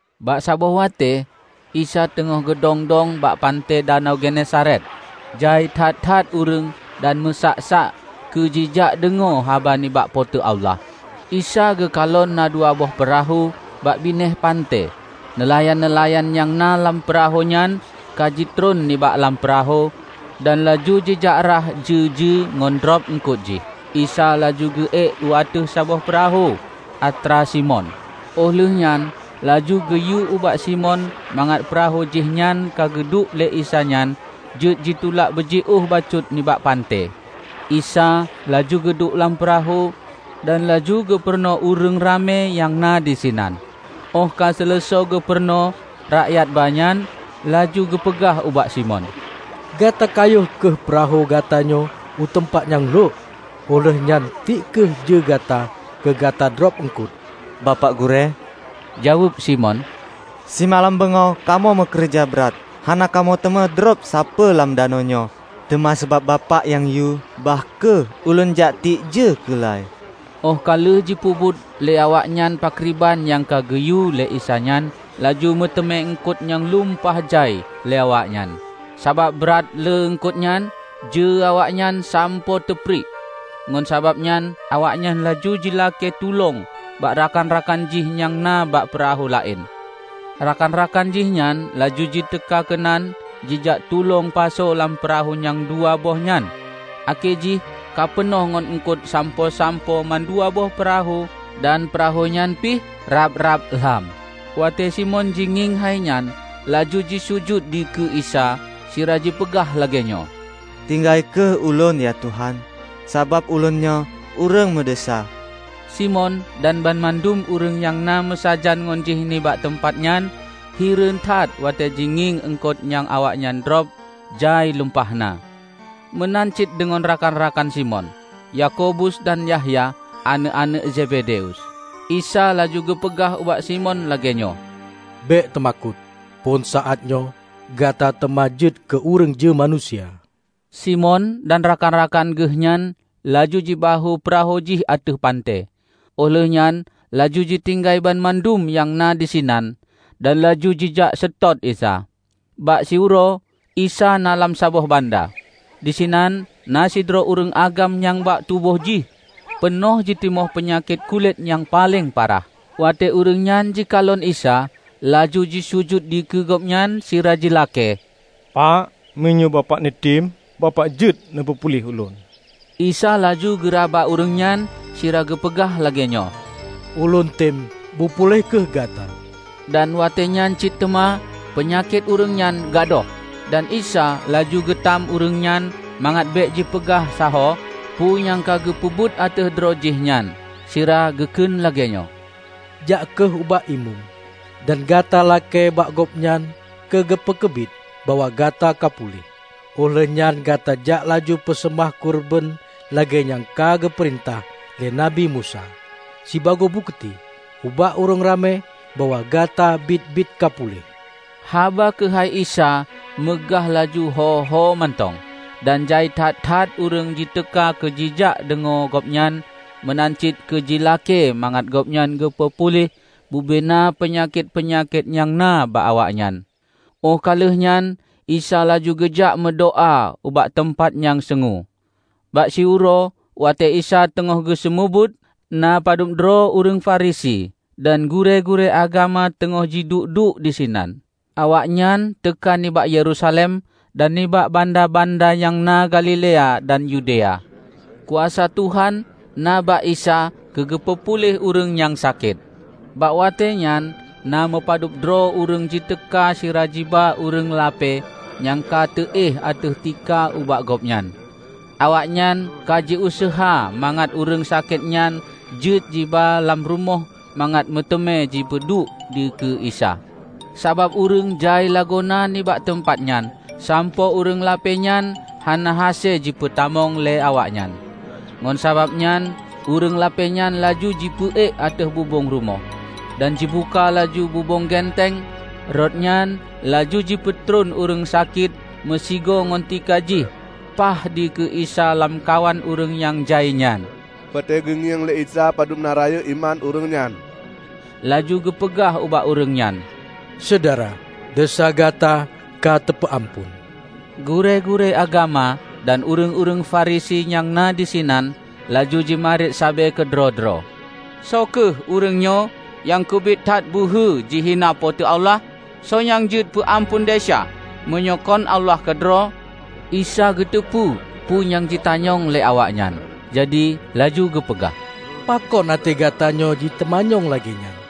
Bak saboh watée, Isa teungoh geudong-dong bak panté Danau Genesaret. Jai that-that ureuëng dan meusak-sak keu jijak deungoe haba nibak Po teu Allah. Isa geukalon na dua boh peurahô bak binéh panté; neulayan-neulayan nyang na lam peurahô nyan ka jitron nibak lam peurahô dan laju jijak rhah jeue-jeue ngon drob eungkot jih. Isa laju geu-ék u ateueh saboh peurahô atra Simon, óh lheuehnyan laju geuyue ubak Simon mangat peurahô jih nyang ka geuduek lé Isa nyan jeuet jitulak beujiôh bacut nibak panté. Isa laju geuduek lam peurahô dan laju geupeurunoe ureuëng ramé nyang na disinan. Óh ka seuleusoe geupeurunoe rakyat ba nyan, laju geupeugah ubak Simon, "Gata kayôh kheueh peurahô gatanyoe u teumpat nyang lhok, óh lheueh nyan tiek kheueh jeue gata keu gata drob eungkot." "Bapak Gurée," jaweueb Simon, "Simalam beungoh kamoe meukeureuja brat, hana kamoe teumé drob sapeue lam danau nyoe! Teuma sabab Bapak nyang yue, bah kheueh; Ulôn jak tiek jeue keula-i." Óh ka lheueh jipeubuet lé awaknyan pakriban nyang ka geuyue lé Isa nyan, laju meuteumé eungkot nyang lumpah jai lé awaknyan, sabab brat lé eungkot nyan, jeue awaknyan sampoe teupriek, ngon sabab nyan awaknyan laju jilakée tulông bak rakan-rakan jih nyang na bak peurahô laén. Rakan-rakan jihnyan laju jiteuka keunan jijak tulông pasoe lam peurahô nyang dua boh nyan akhé jih ka peunoh ngon eungkot sampoe-sampoe mandua boh peurahô, dan peurahô nyan pih rab-rab lham. Watée Simon jingieng hainyan, laju jisujut dikeue Isa, sira jipeugah lagée nyoe, "Tinggai kheueh ulôn, ya Tuhan! Sabab ulônnyoe ureuëng meudesya!" Simon dan banmandum ureuëng nyang na meusajan ngon jih nibak teumpat nyan hireuen that watée jingieng eungkot nyang awaknyan drob jai lumpah na. Meunan cit deungon rakan-rakan Simon, Yakobus dan Yahya aneuëk-aneuëk Zebedeus. Isa laju geupeugah ubak Simon lagée nyoe, "Bék teumakot! Phon saát nyoe gata teuma jeuet keu ureuëng jeue manusia." Simon dan rakan-rakan geuhnyan laju jibahue peurahô jih ateueh panté, óh lheueh nyan laju jitinggai banmandum nyang na disinan, dan laju jijak seutôt Isa. Bak siuroe, Isa na lam saboh banda. Disinan na sidroe ureuëng agam nyang bak tuboh jih peunoh jitimoh peunyakét kulét nyang paleng parah. Watée ureuëng nyan jikalon Isa, laju jisujut dikeue Gobnyan sira jilakée, "Pak, meunyoe Bapak neutem, Bapak jeuet neupeupuléh ulôn!" Isa laju geuraba ureuëng nyan sira geupeugah lagée nyoe, "Ulôn tem, bupuléh kheueh gata!" Dan watée nyan cit teuma peunyakét ureuëng nyan gadôh. Dan Isa laju geutam ureuëng nyan mangat bék jipeugah sahoe peue nyang ka geupeubuet ateueh droe jih nyan, sira geukheun lagée nyoe, "Jak kheueh ubak Imeum, dan gata lakée bak gobnyan keu geupeukeubiet bahwa gata kapuléh. Óh lheuehnyan gata jak laju peuseumah keureubeuen lagée nyang ka geupeurintah lé Nabi Musa, sibagoe bukeuti ubak ureuëng ramé bahwa gata biet-biet ka puléh." Haba keuhai Isa meugah laju hô-hô mantong, dan jai that-that ureuëng jiteuka keu jijak deungoe gobnyan meunan cit keu jilakée mangat gobnyan geupeu puléh bubena peunyakét-peunyakét nyang na bak awaknyan. Óh ka lheueh nyan Isa laju geujak meudoá ubak teumpat nyang seungue. Bak siuroe watée Isa teungoh geuseumeubeuet, na padubdroe ureuëng Farisi dan gurée-gurée agama teungoh jiduek-duek disinan. Awaknyan teuka nibak Yerusalem, dan nibak banda-banda nyang na Galilea dan Yudea. Kuasa Tuhan na bak Isa keu geupeu puléh ureuëng nyang sakét. Bak watée nyan na meupadub droe ureuëng jiteuka sira jiba ureuëng lapée nyang ka teuéh ateueh tika ubak gobnyan. Awaknyan ka jiuseuha mangat ureuëng sakét nyan jeuet jiba lam rumoh mangat meuteumé jipeuduek dikeue Isa. Sabab ureuëng jai lagoena nibak teumpat nyan, sampoe ureuëng lapée nyan hana hase jipeutamong lé awaknyan. Ngon sabab nyan ureuëng lapée nyan laju jipeuék ateueh bubong rumoh. Dan jibuka laju bubong genteng, rot nyan laju jipeutron ureuëng sakét meusigoe ngon tika jih paih dikeue Isa lamkawan ureuëng nyang jai nyan. Watée geungieng lé Isa padub na rayeuk iman ureuëng nyan, laju geupeugah ubak ureuëng nyan, "Syedara, desya gata ka teupeu amphon." Gurée-gurée agama dan ureuëng-ureuëng Farisi nyang na disinan laju jimarit sabe keudroe-droe, "Soe kheueh ureuëng nyoe nyang keubiet that beuhe jihina Po teu Allah? Soe nyang jeuet peu amphon desya, meunyoe kon Allah keudroe?" Isa geuteupeue peue nyang jitanyong lé awaknyan. Jadi laju geupeugah, "Pakon até gatanyoe jiteumanyong lagée nyan?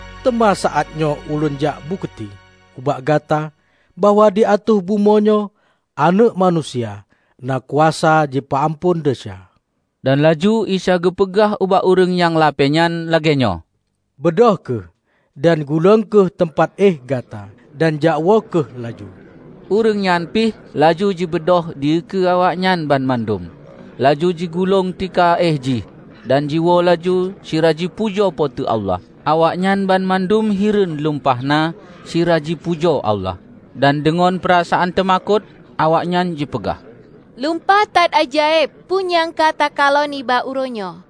Teuma saát nyoe ulôn jok bukeuti ubak gata bahwa di ateueh bumoe nyoe Aneuëk Manusia na kuasa jipeu amphon desya." Dan laju Isa geupeugah ubak ureuëng nyang lapée nyan lagée nyoe, "Beudôh kheueh, dan gulong kheueh teumpat éh gata, dan jakwoe kheueh laju!" Ureuëng nyan pih laju jibeudôh dikeue awaknyan banmandum, laju jigulong tika éh jih, dan jiwoe laju sira jipujoe Po teu Allah. Awaknyan banmandum hireuen lumpah na sira jipujoe Allah. Dan deungoe peurasaan teumakot, awaknyan jipeugah, "Lumpah that ajaéb peue nyang ka takalon nibak uroe nyoe!"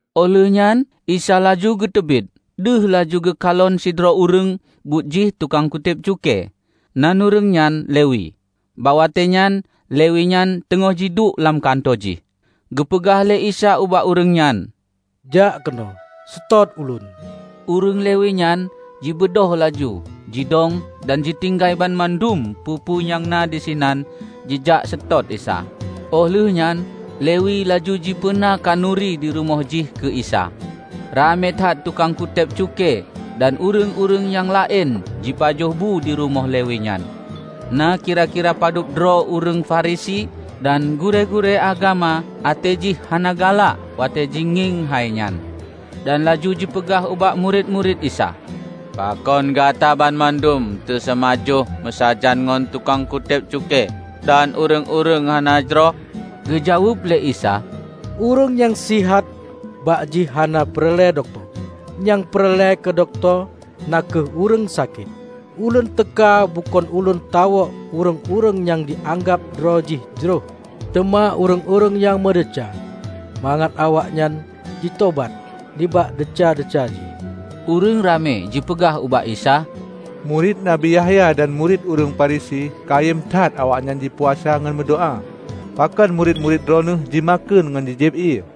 Óh lheuehnyan Isa laju geuteubiet deuh laju geukalon sidroe ureuëng buet jih tukang kutéb cukée, nan ureuëng nyan Lewi, bak watée nyan Lewi nyan teungoh jiduek lam kantô jih. Geupeugah lé Isa ubak ureuëng nyan, "Jak keunoe, seutôt Ulôn." Ureuëng Lewi nyan jibeudôh laju jidong dan jitinggai banmandum peue-peue nyang na disinan jijak seutôt Isa. Óh lheuehnyan Lewi laju jipeuna khanuri di rumoh jih keu Isa. Ramé that tukang kutéb cukée dan ureuëng-ureuëng nyang laén jipajoh bu di rumoh Lewi nyan. Na kira-kira padub droe ureuëng Farisi dan gurée-gurée agama até jih hana galak watée jingieng hai nyan, dan laju jipeugah ubak murit-murit Isa, "Pakon gata banmandum taseumajoh meusajan ngon tukang kutéb cukée dan ureuëng-ureuëng hana jroh?" Geujaweueb lé Isa, "Ureuëng nyang sihat bak jih hana peureulée dokto; nyang peureulée keu dokto na kheueh ureuëng sakét. Ulôn teuka bukon ulôn tawök ureuëng-ureuëng nyang jianggab droe jih jroh, teuma ureuëng-ureuëng nyang meudesya mangat awaknyan jitobat nibak desya-desya jih." Ureuëng ramé jipeugah ubak Isa, "Murit Nabi Yahya dan murit ureuëng Farisi kayém that awaknyan jipuasa ngon meudoá. Pakon murit-murit Droeneueh jimakheun ngon ji-jieb ié."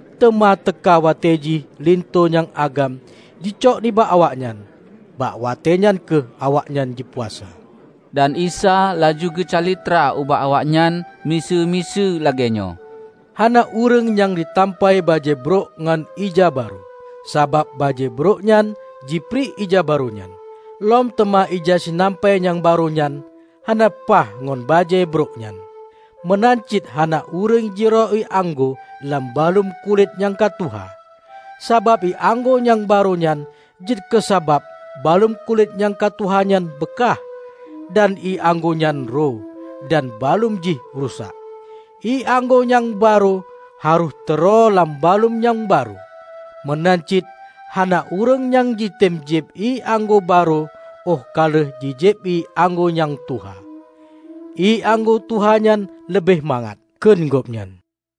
Teuma teuka watée jih linto nyang agam jicok nibak awaknyan. Bak watée nyan kheueh awaknyan jipuasa." Dan Isa laju geucalitra ubak awaknyan miseue-miseue lagée nyoe, "Hana ureuëng nyang jitampai bajée brok ngon ija barô. Sabab bajée brok nyan jipriek ija barô nyan. Lom teuma ija sinampai nyang barô nyan hana paih ngon bajée brok nyan. Meunan cit hana ureuëng jiroe ié anggô lam baluem kulét nyang ka tuha, sabab ié anggô nyang barô nyan jeuet keusabab baluem kulét nyang ka tuha nyan beukah. Dan ié anggô nyan roe, dan baluem jih rusak. Ié anggô nyang barô harôh teuroe lam baluem nyang barô. Meunan cit hana ureuëng nyang jitem jieb ié anggô barô óh ka lheueh jijieb ié anggô nyang tuha. 'Ié anggô tuha nyan leubeh mangat,' kheun gobnyan."